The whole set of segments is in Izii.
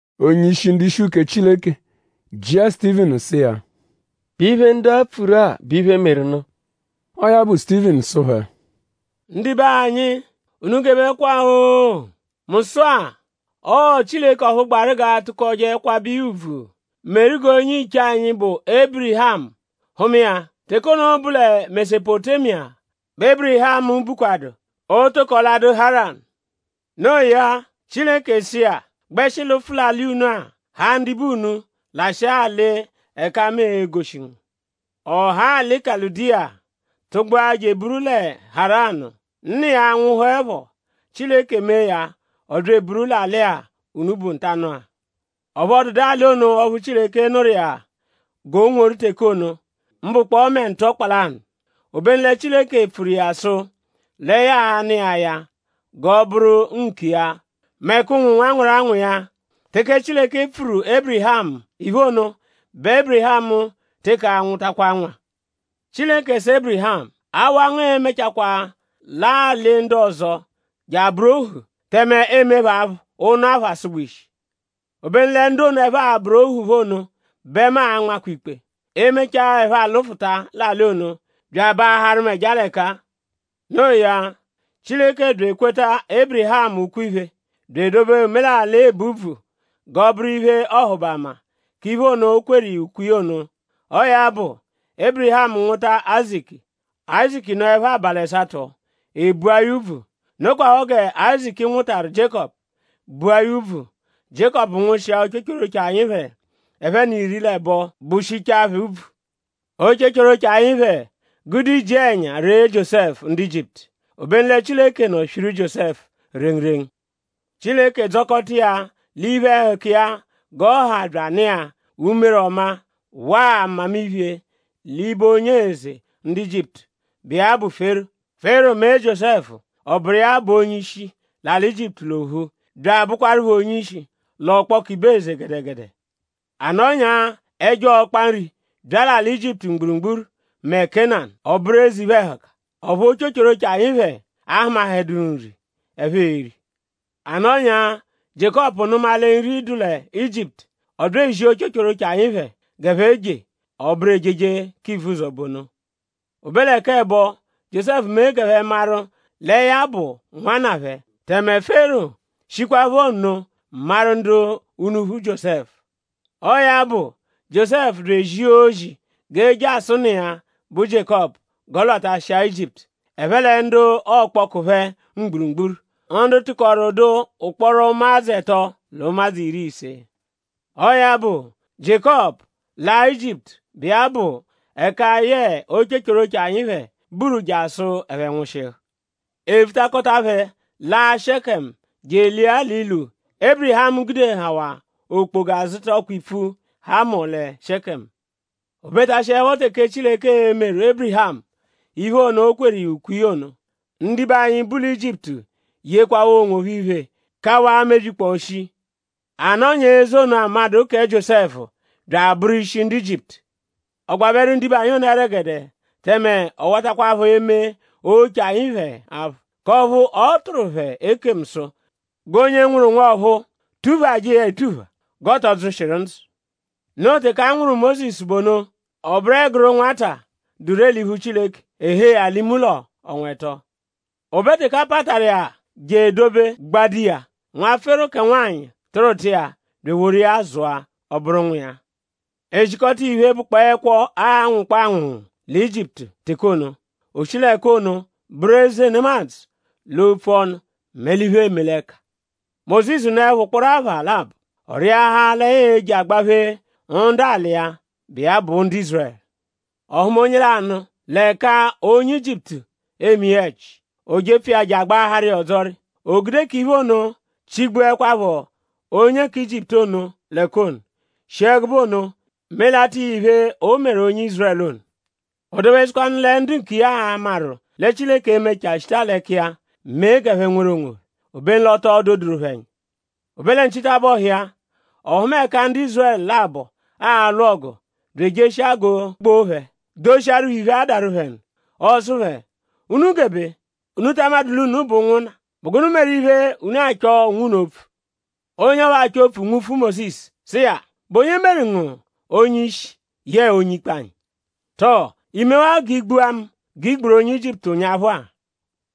Onye-ishi ndu-ishi uke Chileke jịa Sutivinu sụ iya: “?Bụ iphe, ndu-a pfuru-a bụ iphe, meru nụ?” Ọo ya bụ Sutivinu sụ phẹ: Ndibe anyi; unu gebekwaphọ-o! Mu sụ-a; ọo Chileke ọphu gbaru g'a tụkoje kwabẹ iya ùbvù meru g'onye-iche anyi, bụ Ébirihamu hụma iya. Teke ono bụ lẹ Mesopotémiya bẹ Ébirihamu bukwadụ; o toko ladụ Haranu. Noo ya; Chileke sụ iya: “Gbẹshi lụfu l'alị unu-a; haa ndibe unu; lashịa alị ẹka mu l'e-goshi ngu.” Ọ haa alị Kaludiya tụgbua je eburu lẹ Haranu. Nna iya nwụhuepho; Chileke mee ya ọ bya eburu l'alị-a, unu bu ntanụ-a. Ọphu ọ dụdu alị ono ọphu Chileke nụru iya g'o nworu teke ono; mbụkpoo mẹ ntọkpa lanụ. Obenu lẹ Chileke pfuru iya sụ lẹ ya a-nụ iya ya g'ọ bụru nkiya mẹ k'ụnwu nwanwanwaranwa iya. Teke Chileke pfuru Ébirihamu iphe ono bẹ Ébirihamu teke anwụtakwa nwa. Chileke sụru Ébirihamu: Awa ngu e-mechakwaa laa alị ndu ọzo je abụru ohu; tẹme eemee phẹ aphụ ụnu apha asụgba ishi. Obenu lẹ ndu ono, ẹphe a-bụru ohu phẹ ono bẹ mu a-nmakwanu ikpe; e -mechaa ẹphe afụta l'alị ono bya abaaharụ mu ẹja l'ẹka-a. Noo ya; Chileke bya ekweta Ébirihamu ukwe-iphe bya edobe omelalị ebu úbvù g'ọ bụru iphe-ọhubama k'iphe ono, o kweru iya ukwe iya ono. Ọo ya bụ; Ébirihamu nwụta Áyizaku. Áyizaku nọepho abalị ẹsato; e bua ya úbvù. Nokwaphọ gẹ Áyizaku nwụtaru Jiékọpu bụa ya úbvù; Jiékọpu nwụshia ochochoroche anyi phẹ ẹphe n'iri l'ẹbo bushichaa phẹ úbvù. “Ochochoroche anyi phẹ gude iji-ẹnya ree Jiósẹfu ndu Ijiputu. Obenu lẹ Chileke nọ swiru Jiósẹfu rengurengu. Chileke dzọkota iya l'iphe-ẹhuka iya g'ọ ha bya anụ iya umere ọma waa mmamiphe l'ibe onye eze ndu Ijiputu, bụ iya bụ Fero. Fero mee Jiósẹfu; ọ bụru iya bụ onye-ishi l'alị Ijiputu l'ophu; bya abụkwarupho onye-ishi l'ọkpoku ibe eze gẹdegede. “A nọnyaa ẹjo ọkpa nri bya l'alị Ijiputu mgburugburu mẹ Kénanu. Ọ bụru eze iphe-ẹhuka. Ọphu ochochoroche anyi phẹ ahụmaheduru nri, ẹphe e-ri. A nọnyaa; Jiékọpu nụma lẹ nri dụ lẹ Ijiputu. Ọ bya ezia ochochoroche anyi phẹ g'ẹphe jee. Ọ bụru ejeje k'ivuzọ bụ ono. O be lẹ k'ẹbo Jiósẹfu mee g'ẹphe maru lẹ ya bụ nwanna phẹ; tẹme Fero shikwaphọ nno maru ndu unuphu Jiósẹfu. Ọo ya bụ; Jiósẹfu bya ezia ozi g'e je asụ nna iya, bụ Jiékọpu g'ọ lwatashịa Ijiputu; ẹphe lẹ ndu ọkpoku phẹ mgburugburu; ndu tụkoru dụ ụkporo ụmadzu ẹto l'ụmadzu iri l'ise. Ọo ya bụ; Jiékọpu laa Ijiputu, bụ iya bụ ẹka yẹe ochochoroche anyi phẹ buru jasụ ẹphe nwụshihu. E vutakọta phẹ laa Shẹkemu je elia l'ilu, Ébirihamu gudehawaa okpoga zụta ọkpa-ipfu Hamọ lẹ Shẹkemu. “O betashiẹpho teke Chileke e-meru Ébirihamu iphe ono, o kweru iya ukwe iya ono; ndibe anyi, bu lẹ Ijiputu yekwawaa onwophẹ iphe; kawaa mebyikpọo shii. A nọnyaa eze ọzo, amaẹdu kẹ Jiósẹfu bya abụru ishi ndu Ijiputu. Ọ gbabẹru ndibe anyi ono ẹregede tẹme ọ watakwaphọ eme oche anyi phẹ aphụ; k'ọphu ọ tụru phẹ ekemu sụ g'onye nwụru nwa ọ̀phúú tuphajẹ iya etupha; g'ọ tọ dzụshiru ndzụ. Noo teke a nwụru Mósisu bụ ono. Ọ bụru ẹguru nwata, dụ ree l'iphu Chileke. E hee ya l'ime ụlo ọnwa ẹto. O be teke a pataru iya je edobe gbado iya; nwa Fero kẹ nwanyị tụruta iya bya eworu iya zụa; ọ bụru nwa iya. E zikọta iya iphe, bụkpoo ẹkwo, aanwụkpoo anwụnwu lẹ Ijiputu teke ono. O shi l'ẹka ono bụru eze nemadzụ l'opfu ọnu mẹ l'iphe, eeme l'ẹka. “Mósisu nọepho ụkporo apha labọ; ọ rịahaa lẹ ya e-je agbaphee ndu alị iya, bụ iya bụ ndu Ízurẹlu. Ọ hụma onye lanụ l'ẹka onye Ijiputu eme iya ẹji. O jepfu iya je agbaaharu iya ọdzori. O gude k'iphe ono chigbuẹkwapho onye kẹ Ijiputu ono l'ẹka ono; shi ẹgube ono melata iya iphe, o meru onye Ízurẹlu ono. O dobesụkwanu lẹ ndu nkiya a-maru lẹ Chileke e-mechaa shita l'ẹka iya mee g'ẹphe nweru onwophẹ; obenu l'o to doduru phẹ ẹnya. O be lẹ nchitabọhu iya; ọ hụma ẹka ndu Ízurẹlu labọ alwụ ọgu bya ejeshia g'o gboo phẹ; doshiaru phẹ iphe, adaru phẹ nụ. Ọ sụ phẹ: ‘Unu gebe!?Unu ta amadụ l'unu bụ ụnwunna??Bụ gụnu meru iphe, unu achọ onwunu opfu?’ Onye ọphu achọ opfu nwufu Mósisu sụ iya: ‘?Bụ onye meru ngu onye-ishi; yẹe onye-ikpe anyi?’ Tọo?iimewaa g'i gbua mu g'i gburu onye Ijiputu ụnyaphu-a?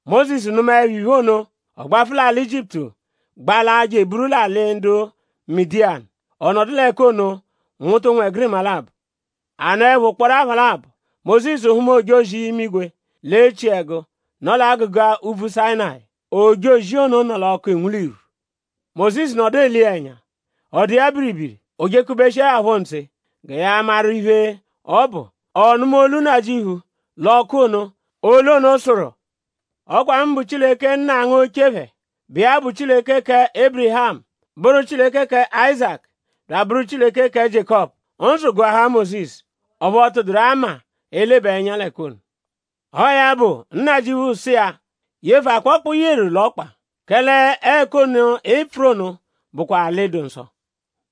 Mósisu nụmaepho iphe ono; ọ gbafụ l'alị Ijiputu gbalaa je eburu l'alị ndu Midiyanu. Ọ nọdu l'ẹka ono nwụta ụnwegirima labọ. “A nọepho ụkporo apha labọ; Mósisu hụma ojozi-imigwe l'echiẹgu, nọ l'agụga úbvú Sayịnayi. Ojozi ono nọ l'ọku, enwu l'irwu. Mósisu nọdu ele iya ẹnya; ọ dụ iya biribiri. O jekubeshiẹ ya phọ ntse gẹ ya maru iphe, ọ bụ; ọ nụma olu Nnajịuphu l'ọku ono. Olu ono sụru: ‘Ọ kwa mu bụ Chileke nna ngu oche phẹ, bụ iya bụ Chileke kẹ Ébirihamu; bụru Chileke kẹ Áyizaku; bya abụru Chileke kẹ Jiékọpu.’ Ndzụ gụahaa Mósisu; ọphu ọ tụduru ama elebaa ẹnya l'ẹka ono. Ọo ya bụ; Nnajịuphu sụ iya: ‘Yefụ akpọkpa, i yeru l'ọkpa; kẹle ẹka ono, ị pfụru ono bụkwa alị, dụ nsọ.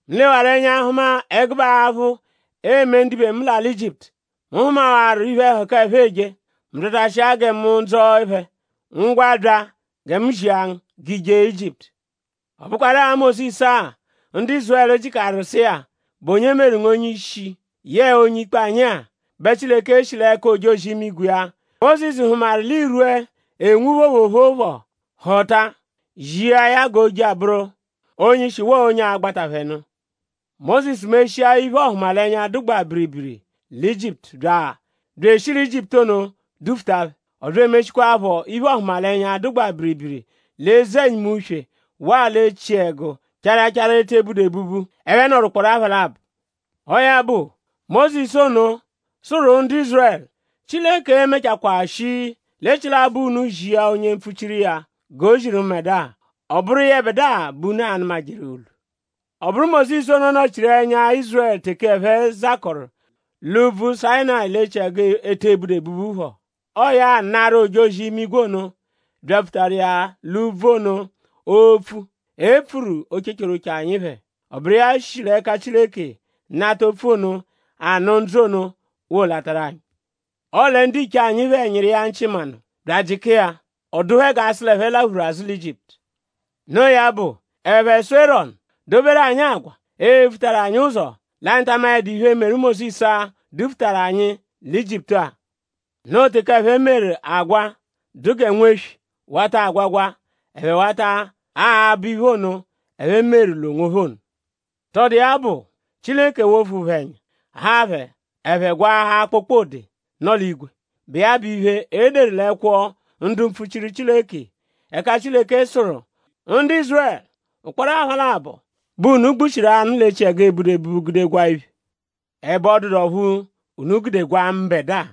Mu lewaru ẹnya hụma ẹgube aphụ, eeme ndibe mu l'alị Ijiputu. Mu hụmawaru iphe-ẹhuka, ẹphe eje; mu byatashia gẹ mu dzọo phẹ. Ngwa; bya gẹ mu zia ngu g'i je Ijiputu.’ “Ọ bụkwaru-a Mósisu-a, ndu Ízurẹlu jịkaru sụ iya: ‘?Bụ onye meru ngu onye-ishi; yẹe onye-ikpe anyi-a?’ bẹ Chileke shi l'ẹka ojozi-imigwe iya, Mósisu hụmaru l'irwu, enwu phoophoophoo phọ họta; zia ya g'o je abụru onye-ishi waa onye a-gbata phẹ nụ. Mósisu meshia iphe-ọhumalenya, dụgbaa biribiri lẹ Ijiputu bya eshi lẹ Ijiputu ono dufuta phẹ. Ọ bya emeshikwaaphọ iphe-ọhumalenya, dụgbaa biribiri lẹ Eze-ẹnyimu-uswe waa l'echiẹgu charachara, e te budu ebubu, ẹphe nọru ụkporo apha labọ. Ọo ya bụ Mósisu ono, sụru ndu Ízurẹlu: ‘Chileke e-mechakwaa shi l'echilabọ unu zia onye mpfuchiru iya; g'o ziru mbẹdua. Ọ bụru yẹbedua bẹ unu a-nụmajeru olu’ Ọ bụru Mósisu ono nọ-chiru ẹnya Ízurẹlu teke ẹphe zakọru l'úbvú Sayịnayi l'echiẹgu, e te budu ebubu phọ. Ọo ya anaru ojozi-imigwe ono, byapfutaru iya l'úbvú ono opfu epfuru ochochoroche anyi phẹ. Ọ bụru iya shi l'ẹka Chileke nata opfu ono, anụ ndzụ ono wolataru anyi. “Ọle ndiche anyi phẹ nyịru iya nchị manụ; bya ajịka iya. Ọ dụ phẹ g'a sụ l'ẹphe laphuru azụ lẹ Ijiputu. Noo ya bụ; ẹphe sụ Erọnu: ‘Doberu anyi agwa, e-vutajẹru anyi ụzo; l'anyi ta amaẹdu iphe, meru Mósisu-a, dufutaru anyi lẹ Ijiputu-a.’ Noo teke ẹphe meru agwa, dụ gẹ nweswi wata agwagwa. Ẹphe wata abọ iphe ono, ẹphe meru l'onwophẹ ono. Tọbudu iya bụ; Chileke wofu phẹ ẹnya; haa phẹ; ẹphe gwaahaa kpokpode, nọ l'igwe, bụ iya bụ iphe, e deru l'ẹkwo ndu mpfuchiru Chileke; ẹka Chileke sụru: “Ndu Ízurẹlu! Ụkporo apha labọ bẹ unu gbushiru anụ l'echiẹgu, e budu ebubu gude gwaa iphe. Ẹbe ọ dụdu ọphu unu gude gwaa mbẹdua.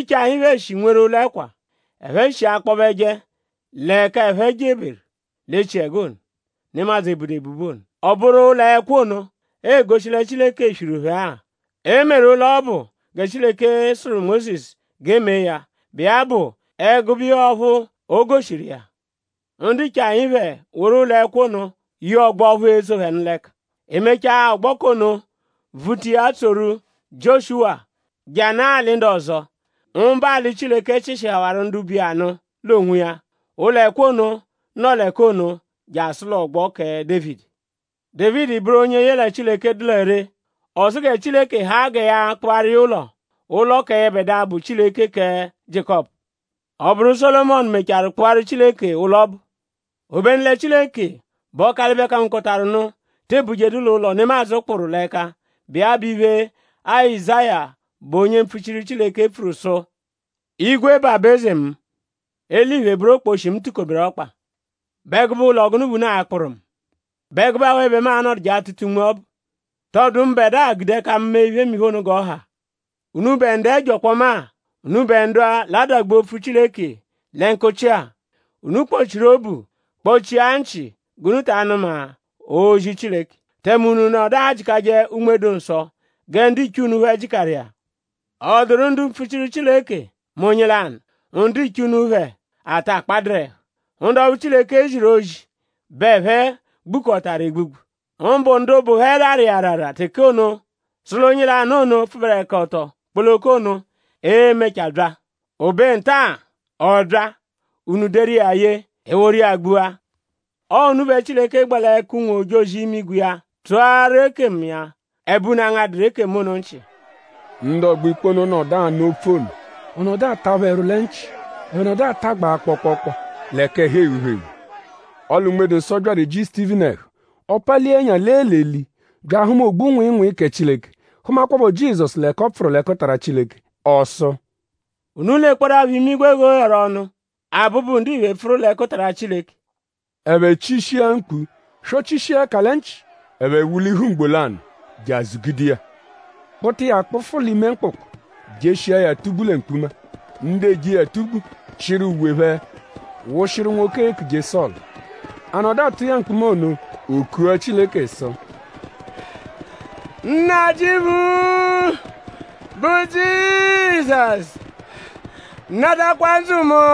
Ndiche anyi phẹ shi nweru ụlo-ẹkwa, ẹphe shi akpọbeje l'ẹka ẹphe jeberu l'echiẹgu ono, nemadzụ ebudu ebubu ono. Ọ bụru ụlo-ẹkwa ono egoshi lẹ Chileke swiru phẹ-a. E meru ụlo ọbu gẹ Chileke sụru Mósisu g'e mee ya, bụ iya bụ ẹgube iya ọphu o goshiru iya. Ndiche anyi phẹ woru ụlo-ẹkwa ono ye ọgbo ọphu etso phẹ nụ l'ẹka. E mechaa; ọgbo k'ono vuta iya tsoru Jioshuwa je anaa alị ndu ọzo; mbụ alị, Chileke chịshihawaru ndu bu iya nụ l'onwiya. Ụlo-ẹkwa ono nọo l'ẹka ono jasụ l'ọgbo kẹ Dévidi. Dévidi bụru onye yẹle Chileke dụ lẹ ree. Ọ sụ gẹ Chileke haa gẹ ya kpụaru iya ụlo; ụlo kẹ yẹbedua, bụ Chileke kẹ Jiékọpu. Ọ bụru Sólomọnu mechaarụ kpụaru Chileke ụlo ọbu. “Obenu lẹ Chileke, bụ Ọkalibe-kangokọtaru-nụ te ebujedu l'ụlo, nemadzụ kpụru l'ẹka, bụ iya bụ iphe, Azáya bụ onye mpfuchiru Chileke pfuru sụ: “Igwe bụ aba-eze mu. Eliphe bụru okposhi, mu tukoberu ọkpa.?Bụ ẹgube ụlo gụnu bẹ unu a-kpụru mu??Bụ ẹgube awe bẹ mu a-nọduje atụta unme ọbu? ?Tọbudu mbẹdua gude ẹka mu mee iphemiphe ono g'ọ ha? “Unubẹ ndu ẹjo ọkpoma-a; unubẹ ndu-a, l'adagbu opfu Chileke lẹ nkụchi-a; unu kpọ-chiru obu kpọ-chia nchị g'unu ta anụma ozi Chileke. Tẹme unu nọdu ajịkaje Unme-dụ-Nsọ gẹ ndiche unu phẹ jịkaru iya. ?Ọ dụru ndu mpfuchiru Chileke mẹ onye lanụ, ndiche unu phẹ ata kpadụru ẹhu? Ndu ọphu Chileke ziru ozi bẹ ẹphe gbukọtaru egbugbu; mbụ ndu bụ phẹ rarụ iya arara teke ono sụ l'onye lanụ ono, pfụberekoto kpoloko ono e-mechaa bya. O be nta-a ọ bya: unu deru iya ye; e eworu iya gbua. Ọo unu bẹ Chileke gbẹ l'ẹka ụnwu-ojozi-imigwe iya tụaru ekemu iya; ẹbe unu angaduru ekemu ono nchị.” “Ndu ọgbo-ikpe ono nọdu anụ opfu ono; ọ nọdu ata phẹ ẹru lẹ nchị. Ẹphe nọdu atagbaa kpọokpookpo; l'ẹka ẹhu eghu phẹ eghu. Ọle Unme-dụ-Nsọ byaru eji Sutivinu ẹhu. Ọ palia ẹnya lee l'eli; bya ahụma ogbu-nwịinwii kẹ Chileke; hụmakwapho Jizọsu l'ẹka ọ pfụru l'ẹkutara Chileke. Ọ sụ: Unu lekpọdapho imigwe g'o gheru ọnu; Abụbu-Ndiphe pfụru l'ẹkutara Chileke!” Ẹphe chishia mkpu swọ-chishia ẹka lẹ nchị. Ẹphe wulihu ugbo lanụ je azụgude iya; kpụta iya kpụfu l'ime mkpụkpu; jeshia ya atugbu lẹ mkpuma. Ndu eje iya atugbu chịru uwe phẹ wụshiru nwoke, eekuje Sọlu. A nọdu atụ iya mkpuma ono; o kua Chileke sụ: “Nnajịuphu, bụ Jizọsu; natakwa ndzụ mu!”